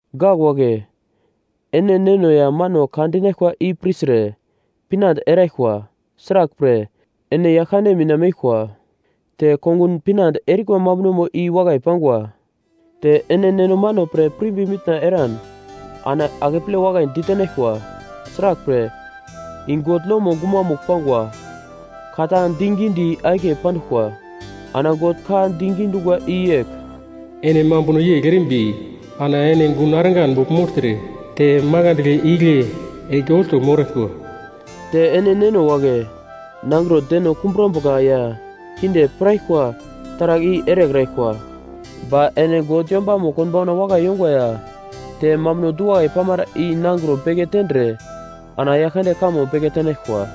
Gak wagle, ene neno ya mano ka dinaglkwa i pirtre pinande eraglkwa, sraglpre, ene Yaglkande mina meglkwa, te kongun pinande erikwa mambunomo i wakai pangwa. Te ene neno mano pre pirimbi mitna eran ana akeple wakai ditenaglkwa, sraglpre, i God lomo gumamugl pangwa, ka ta digidi akiye panduglkwa. Ana God ka digi dungwa i yegl: “Ene mambuno yegl erimbi ana ene gun argan bogl mogltre te makandle igle enge olto moraglkwa.” Te ene neno wagle, nangro deno kumbrambuka ya kinde piraglkwa taragl i erekraglkwa. Ba ene God yombamo konbauna wakai yongwa ya te mambuno du-wakai pamara i nangro beke tendre ana Yaglkande kamo beke tenaglkwa.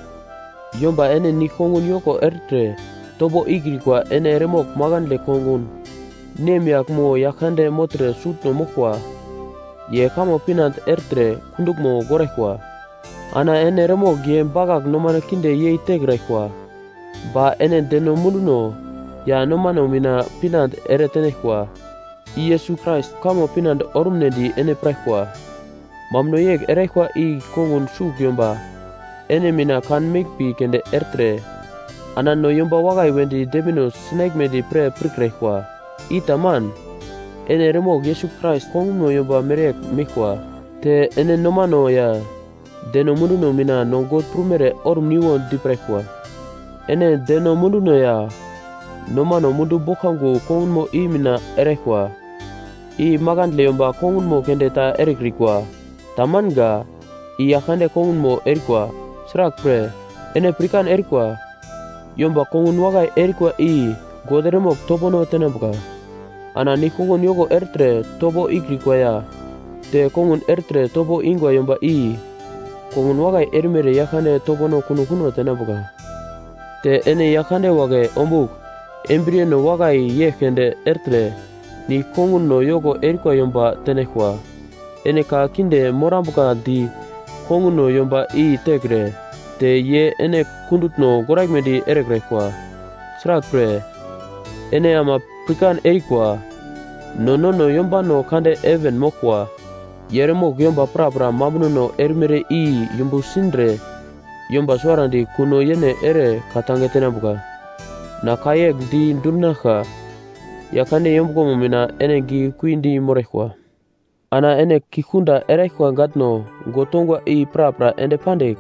Yomba ene nigl-kongun yoko ertre topo ikrikwa ene eremogl makandle kongun nemyagl mo yagl kande mogltre sutno moglkwa, ye kamo pinande ertre kunduglmo goraglkwa. Ana ene eremogl ye bakagl nomano kinde yei tekraglkwa, ba ene deno munduno ya nomano mina pinande ere tenaglkwa, i Yesus Krais kamo pinande orumnedi ene piraglkwa. Mambuno yegl eraglkwa i kongun sugl yomba ene mina kan meglmbi keunde ertre, ana no yomba wakai wedi dembino sinaglmedi pre pirkraglkwa, i taman. Ene eremogl Yesus Krais kongunmo yomba mereyegl meglkwa, te ene nomano ya deno munduno mina no God prumere orumniwo di piraglkwa. Ene deno munduno ya nomano mundu boglkango kongunmo i mina eraglkwa, i makandle yomba kongunmo keunde ta erekrikwa, tamanga. I Yaglkande kongunmo erikwa. Sraglpre, ene pirkan erikwa, yomba kongun wakai erikwa i God eremogl topono tenambuka. Ana nigl-kongun yoko ertre topo ikrikwa ya te kongun ertre topo ingwa yomba i kongun wakai erimere Yaglkande topono kuno kuno tenambuka. Te ene yagl kande wagle ombugl embriyeno wakai yegl keunde ertre nigl-konguno yoko erikwa yomba tenaglkwa. Ene ka kinde morambuka di konguno yomba i tekre te ye ene kundutno goraglmedi erekraglkwa. Sraglpre, ene ama pirkan erikwa, no nono yombano kande heven moglkwa, ye eremogl yomba prapra mambunono erimere i yumbu sindre yomba suwarandi kuno yene ere ka-tange tenambuka. Na ka yegl di dundinaglka. Yaglkande yombuglomo mina ene giglekui di moraglkwa. Ana ene kigl kunda eraglkwa gatno God tongwa i prapra ende pandigl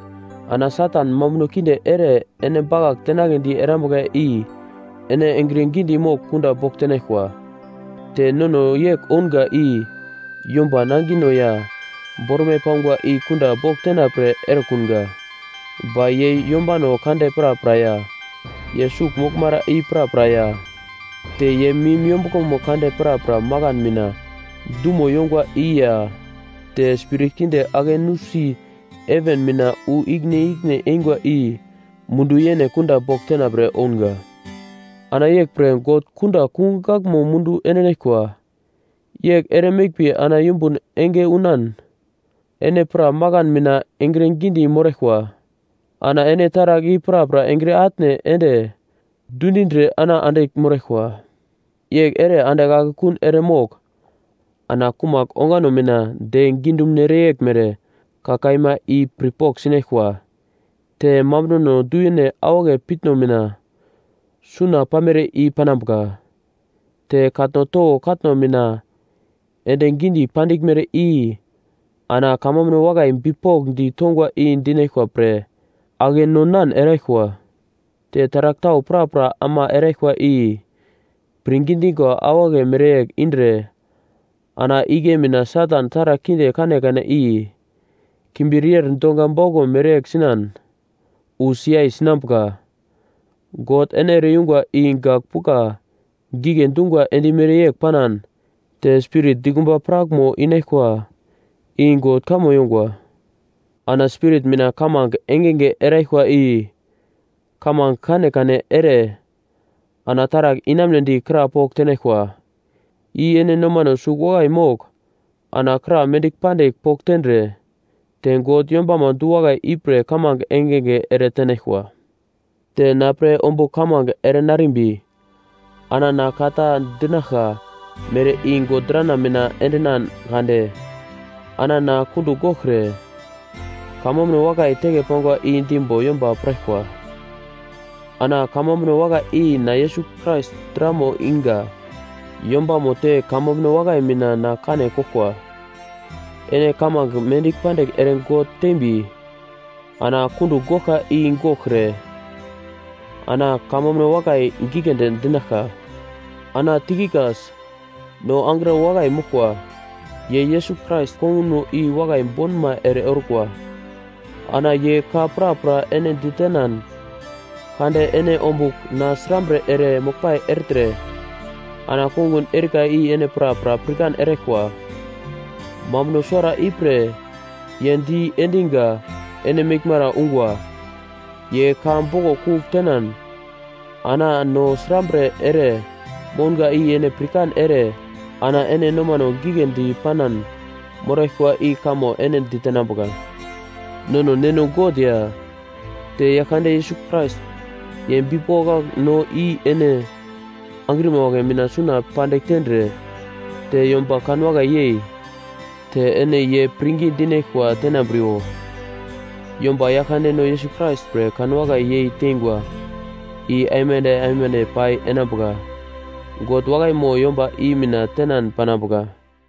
ana Satan mambuno kinde ere ene bakagl tenagledi erambuka i ene engre gidi mogl kunda bogl tenaglkwa. Te nono yegl ounga i yomba nangino ya bormai pangwa i kunda bogl tena pre erekunga, ba ye yombano kande prapra ya, ye sugl moglmara i prapra ya te ye mim yombuglomo kande prapra makan mina dumo yongwa i ya te spirit kinde ake nusi heven mina wu ikine ikine engwa i mundu yene kunda bogl tenapre ounga. Ana yeglpre God kunda kungugl gaglmo mundu endinaglkwa, yegl ere meglmbi ana yumbun enge unan, ene pra makan mina engre gidi moraglkwa, ana ene taragl i prapra engre atne ende dundindre ana andigl moraglkwa. Yegl ere andigl akekun ere mogl ana kumagl ongano mina de gidumunere yeglmere ka kaima i pirpogl sinaglkwa, te mambunono du-yene awagle piutno mina suna pamere i panambuka, te katno towo katno mina ende gidi pandiglmere i ana kamambuno wakai bipokndi tongwa i dinaglkwa pre ake non-nan eraglkwa. Te taragl tau prapra ama eraglkwa i, pirngi dingwa awagle mereyegl indre ana igle mina Satan taragl kinde kanekane i kimbir yer donga bauglo mereyegl sinan wu siyai sinambuka. God ene ere-yungwa i gagl pugla gigle dungwa endimere yegl panan, te Spirit dikumba prakmo inaglkwa, i God kamo yongwa. Ana Spirit mina kamange engenge eraglkwa i kamange kanekane ere ana taragl inamunedi kra pogl tenaglkwa. I ene nomano sugl wakai mogl ana kra mendigl pandigl pogl tendre, te God yombamo du-wakai ipre kamange engenge ere tenaglkwa. Te na pre ombugl kamange ere narimbi ana na ka ta dinaglka mere i God drana mina endinan kade, ana na kundugl goglkre kamambuno wakai teke pangwa i dimbo yomba piraglkwa. Ana kamambuno wakai i na Yesus Krais dramo inga yombamo te kamambuno wakai mina na kane koglkwa. Ene kamange mendigl pandigl ere God tembi na kundugl goglka i goglkre ana kamambuno wakai giglendi dinaglka. Ana Tikikas, no angro wakai moglkwa, ye Yesus Krais kongunmo i wakai bonma ere orkwa, ana ye ka prapra ene ditenan kade ene ombugl na srambre ere moglpai ertre ana kongun erika i ene prapra pirkan eraglkwa. Mambuno suwara ipre ye di endinga ene meglmara ungwa, ye ka boglo kugl tenan ana no srambre ere mounga i ene pirkan ere ana ene nomano giglendi panan moraglkwa i kamo ene ditenambuka. Nono Neno God ya te Yaglkande Yesus Krais, ye bipokak no i ene angrima wagle mina suna pandigl tendre te yomba kanwakai yei, te ene ye pirngi dinaglkwa tenambriwo. Yomba Yaglkandeno Yesus Krais pre kanwakai yei tengwa, i aimande aimande pai enambuka. God wakaimo yomba i mina tenan panambuka.